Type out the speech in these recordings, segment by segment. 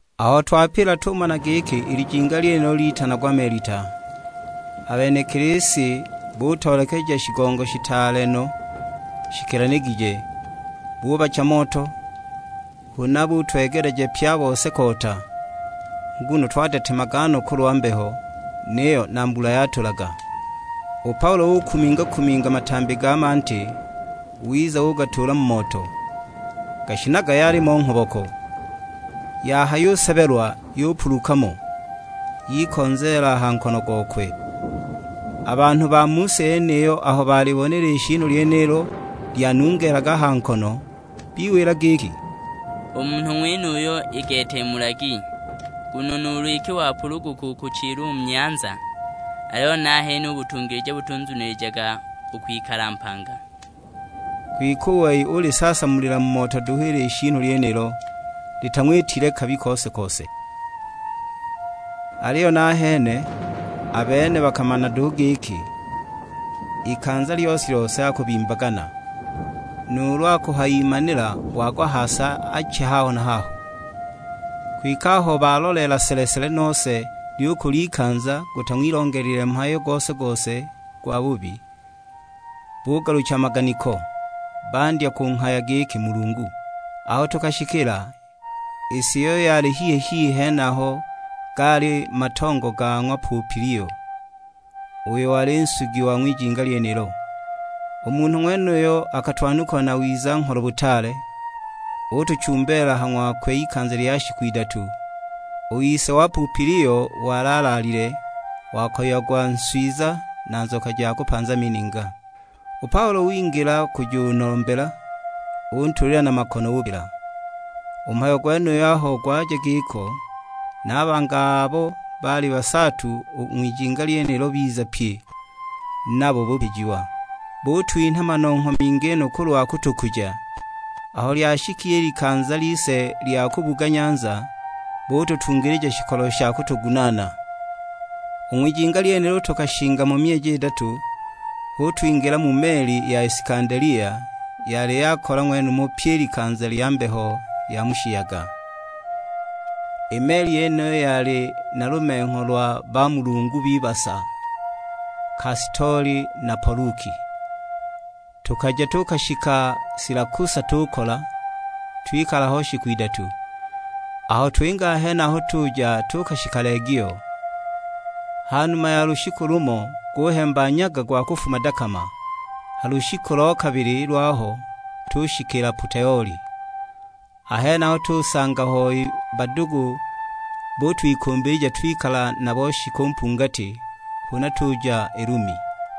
Aho twapila tumana giki i lijinga lyenilo litanagwa Melita. A benekili si butoolekeja shigongo shitaale no shikilanigije; bubacha moto, huna butwegeleja pye a bose koota. Nguno twadetemaga no kulwa mbeho, niyo na mbula yatulaga. U Paulo ukuminga-kuminga matambi ga manti, wiza ugatuula mu moto; gashinaga yalimo nghoboko, yahayusebelwa yupuluka mo, yikonzeela a ha nkono gokwe. A banhu ba mu si yeniyo aho balibona i lishiinu lyenilo lyanungeelaga a ha nkono, biwila giki; "U munhu ng'wenuyu i gete mulagi, nguno nuulu iki wapuluguka u kuchila u mu nyanza, aliyo nahene u butungilija butunzunilijaga u kwikala mpanga!" Kwike u wei ulisaasamulila mu moto duhu i lishiinu lyenilo, litang'witile kabi kose-kose. Aliyo nahene a bene bakamana duhu giki, ikanza lyose-lyose akubimbagana, nuulu akuhayimanila wagwa ha si ache haho na haho. Kwike aho baloleela sele-sele nose lyukula ikanza gutang'wilongelile mhayo gose-gose gwabubi, bugalucha a maganiko, bandya kunghaya giki mulungu. Aho tukashikila, i si iyo yali hihi-hihi henaho gaali matongo ga ng'wa Pupilio, uyo wali nsugi wa ng'wijinga lyenilo. U munhu ng'wenuyo akatwanukula na wiza-ngholo butaale, utuchumbeela ha ng'wakwe ikanza lya shiku idatu. U ise wa ng'wa Pupilio wali alaalile; wakoyiagwa nswiza na nzoka ja kupanza mininga. U Paulo wingila kujunombela, untuulila na makono upila. U mhayo gwenuyo aho gwaja giko, na a bangi abo baali basaatu u ng'wijinga lyenilo biza pye; nabo bupijiwa. Butwinha manongho mingi no kulwa kutukuja; aho lyashika i likanza lise lya kubuga nyanza, bututungilija shikolo sha kutugunaana. U ng'wijinga lyenilo tukashinga mo myeji idatu, hu twingila mu meli ya Isikandelia, yali yakola ng'wenumo pyi i likanza lya mbeho ya mu shiyaga. I meli yeniyo yali na lumengho lwa bamulungu b'ibasa, Kastoli na Poluki. Tukaja tuukashika Silakusa tukola, twikala ho shiku idatu. Aho twinga a henaho tuja tuukashika Legio. Ha numa ya lushiku lumo guhemba nyaga gwa kufuma dakama; ha lushiku lo kabili lwaho tushikiila Poteoli. A henaho tusanga hoi badugu butwikumbilija twikala nabo shiku mpungati, huna tuja i Lumi.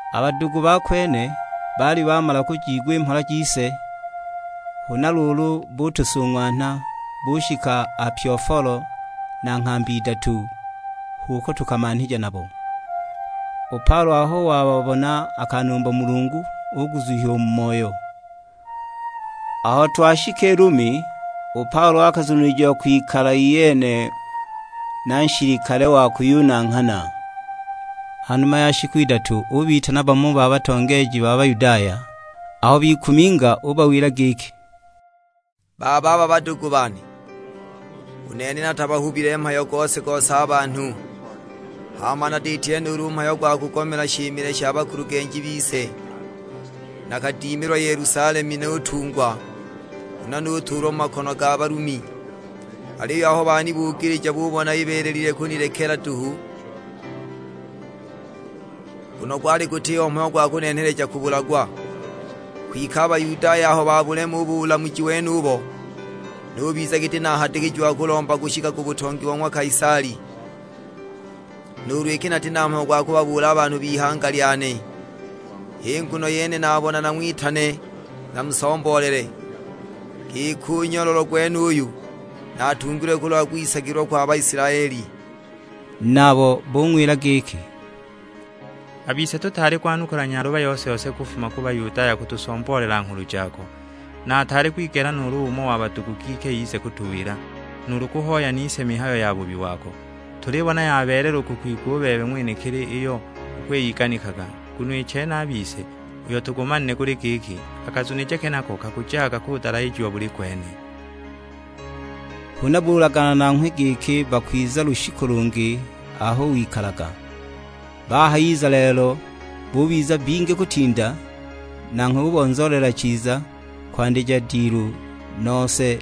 A badugu ba kwene baali bamala kujiigwa i mhola jise; huna luulu butusung'wanha, bushika Apiofolo na Nghambi Idatu, h'uko tumanhija nabo. U Paulo aho wababona akanumba Mulungu, uguzuhiwa u mu moyo. Aho twashika i Lumi, u Paulo akazunilijiwa kwikala iyene na nshilikale wa kuyunanghana. Ha numa ya shiku idatu, ubitana bamo ba batongeeji ba Bayudaya. Aho bikuminga ubawila giki, "Bababa badugu bane, u nene natabahubile mhayo gose-gose a banhu, hama natiitile nuulu mhayo gwa kugomela shimile sha bakulugenji bise. Nakadimilwa Yelusalemu nutungwa, huna nutuulwa mu makono ga Balumi. Aliyo aho banibugilija bubona ibeelelile kunilekela duhu, nguno gwali gutiho mhayo gwa kunenheleja kubulagwa. Kwike a Bayudaya aho babulema u bulamuji wenubo, nubiza giti nahadikijiwa kulomba kushika ku butongi bo ng'wa Kaisali; nuulu iki nati na mhayo gwa kubabuula a banhu b'ihanga lyane. H'i nguno yene nabona nang'witane namusomboolele, giki u nyololo gwenuyu natungilwe kulwa kwisagilwa kwa Baisilaeli." Nabo bung'wila giki, "A bise tutaali kwanukula nyaluba yose-yose kufuma ku Bayudaya kutusomboolela nghulu jako; na ataali kwigela nuulu umo wa badugu giki ize kutuwila, nuulu kuhoya nise mihayo yabubi wako. Tulibona yabeelela u kukwigwa u bebe ng'wenekili iyo ukwiyiganikaga; nguno i chene a bise uyo tugumanile guli giki, a kazunije kenako kakujaga kudalahijiwa buli kwene." Huna bulagana nanghwe giki bakwiza lushiku lungi aho wikalaga. Bahayiza lelo bubiza bingi kutinda, nanghwe ubonzoolela chiza, kwandija dilu, nose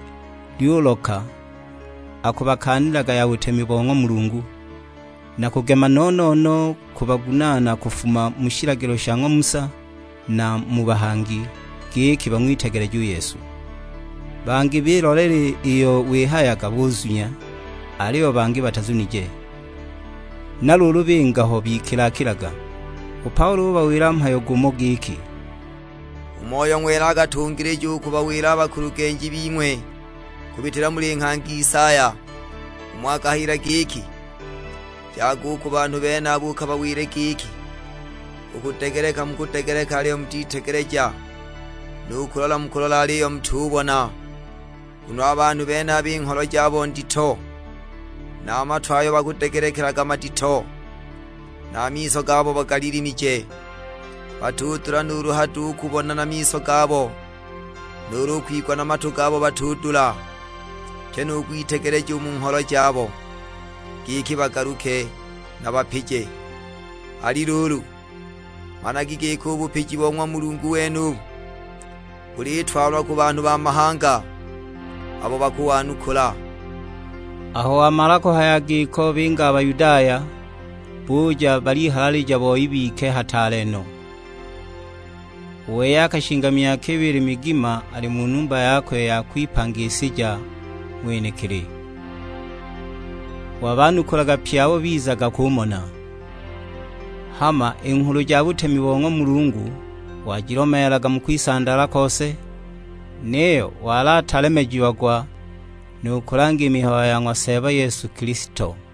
lyuloka akubakaanilaga ya butemi bo ng'wa Mulungu; na kugema no-no-no kubagunaana kufuma mu shilagilo sha ng'wa Musa na mu bahangi, giki bang'witegeleje u Yesu. Bangi biloleela iyo wihayaga buzunya; aliyo bangi batazunije. Na luulu binga ho bikila-kilaga. U Paulo ubawila mhayo gumo; giki, "U Moyo Ng'wela akatungilija u kubawila a bakulugenji bing'we kubitila muli nghangi Isaya. Umo akahayila giki, 'Jaga u ku banhu benaba ukabawile giki, u kudegeleka mukudegeleka aliyo mutitegeleja, nu kulola mukulola aliyo mutubona. Nguno a banhu benaba i ngholo jabo ndito, na a matu ayo bakudegelekelaga madito, na a miso gabo bagalilimije. Batudula nuulu hado u kubona na miso gabo, nuulu u kwigwa na matu gabo batudula; pyi nu kwitegeleja u mu ngholo jabo, giki bagaluke nabapije.' Ali luulu, managi giki u bupiji bo ng'wa Mulungu wenubu, bulitwalwa ku banhu ba mahanga, abo bakuwanukula." Aho wamala kuhaya giko binga a Bayudaya; buja balihalalija boi bike hataale no. U wei akashinga myaka ibili migima ali mu numba yakwe ya kwipangisija ng'wenekili; wabanukulaga pye abo bizaga kumona. Hama i nghulu ja butemi bo ng'wa Mulungu wajilomeelaga mu kwisandaala kose, niyo wali atalemejiagwa nu kulanga i mihayo ya ng'wa Seeba Yesu Kilisto.